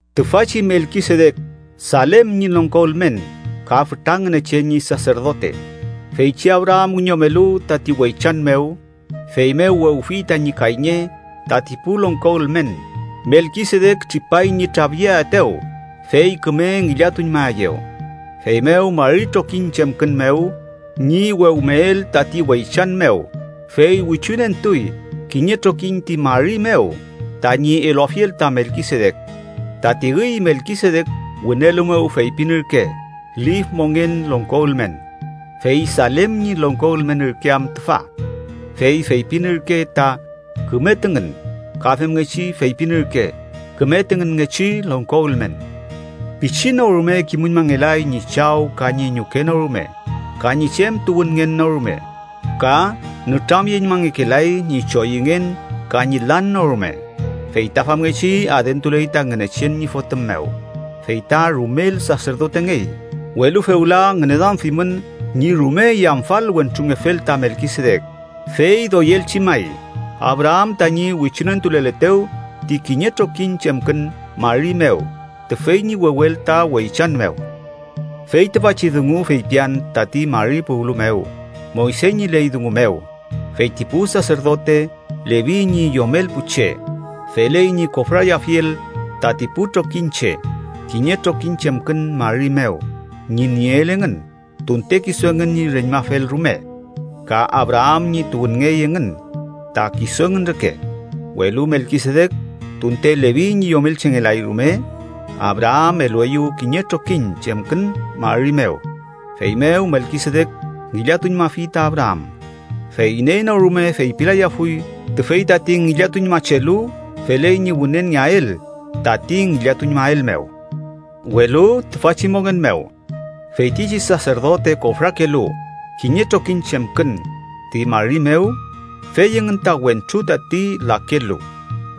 Tüfachi Melkisedek Salem ñi longko ülmen ka fütra Ngünechen ñi saserdote. Feychi Abraam wiñomelu tati weychan mew, feymew wewfi tañi kayñe tati pu longko ülmen. Melkisedek tripay ñi trafyeaetew, fey küme ngillatuñmaeyew, feymew mari trokiñ chemkün mew ñi wewmeel tati weychan mew, fey wichunentuy kiñe trokiñ ti mari mew tañi eluafiel ta Melkisedek. Tati üy Melkisedek wünelu mew feypin ürke lif mongen longko ülmen, fey Salem ñi longko ülmen ürke am tüfa, fey feypin ürke ta “küme tüngün” ka femngechi feypin ürke: “küme tüngünngechi longko ülmen.” Pichi no rume kimüñmangeley ñi chaw ka ñi ñuke no rume ka ñi chem tuwünngen no rume, ka nütramyeñmangekelay ñi choyüngen ka ñi lan no rume, fey ta famngechi adentuley ta Ngünechen ñi Fotüm mew, fey ta rumel saserdotengey. Welu fewla, ngüneduamfimün ñi rume yamfal wentrungefel ta Melkisedek, fey doyelchi may Abraam mew tañi wichunentuleletew ti kiñe trokiñ chemkün mari mew tüfey ñi wewel ta weychan mew. Fey tüfachi dungu feypian tati mari puwlu mew Moyse ñi ley dungu mew. Fey ti pu saserdote Levi ñi yomel pu che feley ñi kofrayafiel tati pu trokiñche kiñe trokiñ chemkün mari mew ñi nieel engün tunte kisu engün ñi reñmafel rume, ka Abraam ñi tuwünngey engün ta kisu engün reke, Welu Melkisedek, tunte Levi ñi yomelchengelay rume, Abraam elueyew kiñe trokiñ chemkün mari mew, feymew Melkisedek ngillatuñmafi ta Abraam. Fey iney no rume feypilayafuy tüfey tati ngillatuñmachelu feley ñi wünenngeael tati ngillatuñmael mew. Welu, tüfachi mongen mew, feytichi saserdote kofrakelu kiñe trokiñ chemkün ti mari mew fey engün ta wentru tati lakelu,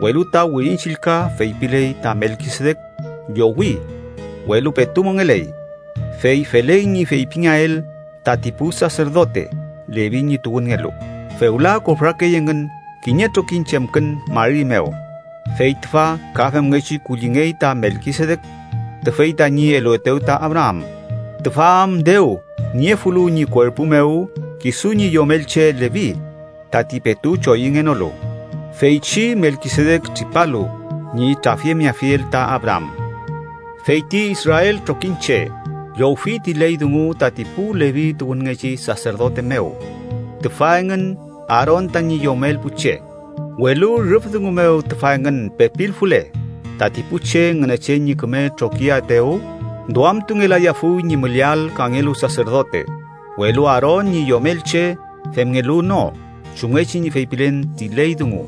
welu ta Wirin Chillka feypiley ta Melkisedek llowi welu petu mongeley. Fey feley ñi feypingeael tati pu saserdote Levi ñi tuwünngelu, fewla kofrakey engün kiñe trokiñ chemkün mari mew, fey tüfa ka femngechi kullingey ta Melkisedek tüfey tañi eluetew ta Abraam, tüfa am dew niefulu ñi kuerpu mew kisu ñi yomelche Levi tati petu choyüngenolu, feychi Melkisedek tripalu ñi trafyemeafiel ta Abraam. Fey ti israel trokiñche llowfi ti ley dungu tati pu Levi tuwünngechi saserdote mew, tüfa engün Aaron tañi yomel pu che. Welu rüf dungu mew tüfa engün pepilfule tati pu che Ngünechen ñi küme trokiaetew, duamtungelayafuy ñi müleael kangelu saserdote, welu Aaron ñi yomelche femngelu no chumngechi ñi feypilen ti ley dungu,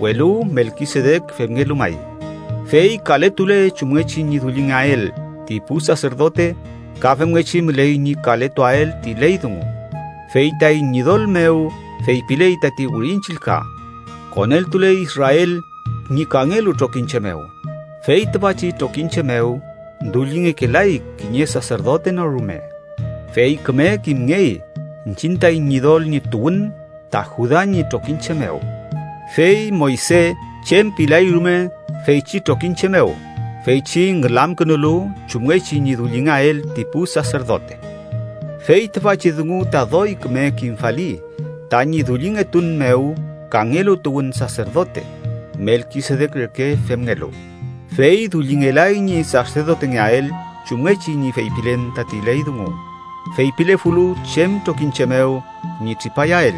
welu Melkisedek femngelu may. Fey kaletule chumngechi ñi dullingeael ti pu saserdote, ka femngechi müley ñi kaletuael ti ley dungu. Fey taiñ Ñidol mew feypiley tati Wirin Chillka, koneltuley Israel ñi kangelu trokiñche mew, fey tüfachi trokiñche mew dullingekelay kiñe saserdote no rume. Fey küme kimngey iñchiñ taiñ Ñidol ñi tuwün ta Juda ñi trokiñche mew, fey Moyse chem pilay rume feychi trokiñche mew, feychi ngülamkünulu chumngechi ñi dullingeael ti pu saserdote. Fey tüfachi dungu ta doy küme kimfali tañi dullingetun mew kangelu tuwün saserdote, Melkisedek reke femngelu, fey dullingelay ñi saserdotengeael chumngechi ñi feypilen tati ley dungu feypilefulu chem trokiñche mew ñi tripayael,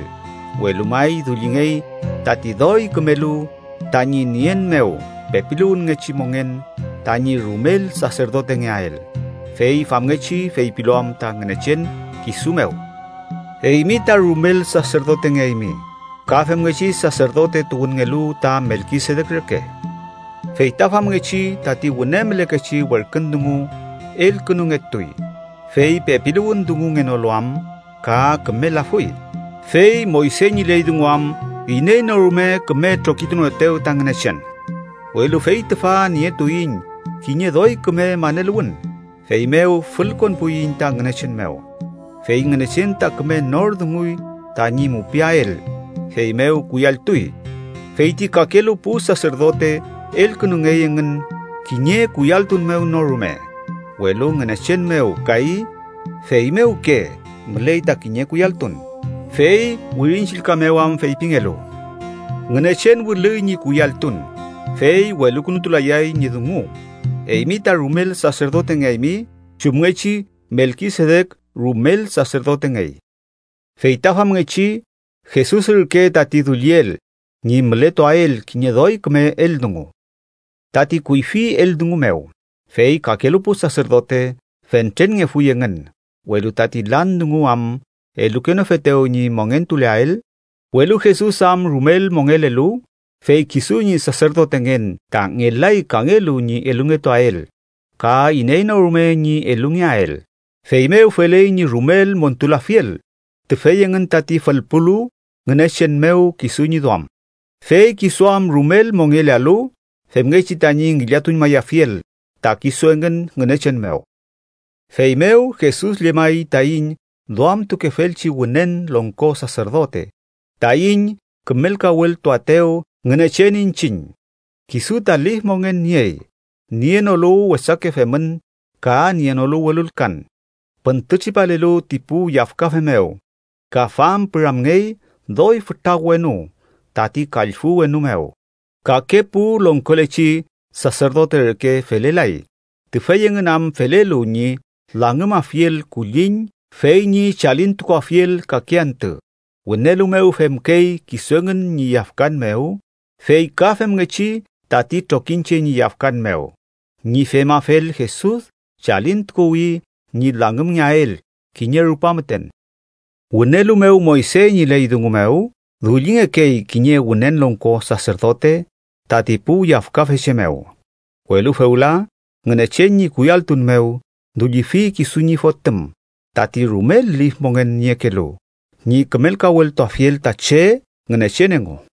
welu may dullingey tati doy kümelu tañi nien mew pepiluwünngechi mongen tañi rumel saserdotengeael. Fey famngechi feypilu am ta Ngünechen kisu mew: “Eymi ta rumel saserdotengeaymi ka femngechi saserdote tuwünngelu ta Melkisedek reke.” Fey ta famngechi tati wüne mülekechi werkün dungu elkünungetuy, fey pepiluwün dungungenolu am ka kümelafuy. Fey Moyse ñi ley dungu am iney no rume küme trokitunoetew ta Ngünechen, welu fey tüfa nietuiñ kiñe doy küme maneluwün, feymew fülkonpuiñ ta Ngünechen mew. Fey Ngünechen ta küme nor dunguy tañi mupiael, feymew kuyalltuy. Fey ti kakelu pu saserdote elkünungey engün kiñe kuyalltun mew no rume. Welu Ngünechen mew kay feymewke müley ta kiñe kuyalltun, fey Wirin Chillka mew am feypingelu: “Ngünechen wülüy ñi kuyalltun, fey welukünutulayay ñi dungu eymi ta rumel saserdotengeaymi chumngechi Melkisedek rumel saserdotengey.” Fey ta famngechi, Jesus ürke tati dulliel ñi mületuael kiñe doy küme eldungu, tati kuyfi eldungu mew. Fey kakelu pu saserdote fentrenngefuy engün, welu tati lan dungu am elukenofetew ñi mongentuleael. Welu Jesus am rumel mongekelu, fey kisu ñi saserdotengen ta ngelay kangelu ñi elungetuael ka iney no rume ñi elungeael. Feymew feley ñi rumel montulafiel tüfey engün tati fülpulu Ngünechen mew kisu ñi duam, fey kisu am rumel mongelealu, femngechi tañi ngillatuñmayafiel ta kisu engün Ngünechen mew. Feymew Jesus llemay taiñ duamtukefelchi Wünen Longko Saserdote taiñ kümelkaweltuaetew Ngünechen iñchiñ, kisu ta lif mongen niey, nienolu wesake femün ka nienolu welulkan, püntütripalelu ti pu yafkafe mew ka fampüramngey doy fütra wenu tati kallfü wenu mew. Kake pu longkolechi saserdote reke felelay, tüfey engün am felelu ñi langümafiel kulliñ fey ñi chalintukuafiel kake antü. Wünelu mew femkey kisu engün ñi yafkan mew, fey ka femngechi tati trokiñche ñi yafkan mew. Ñi femafel, Jesus chalintukuwi ñi langümngeael kiñe rupa müten. Wünelu mew Moyse ñi ley dungu mew dullingekey kiñe Wünen Longko Saserdote tati pu yafkafe che mew, welu fewla Ngünechen ñi kuyalltun mew dullifi kisu ñi Fotüm, tati rumel lif mongen niekelu, ñi kümelkaweltuafiel ta che Ngünechen engu.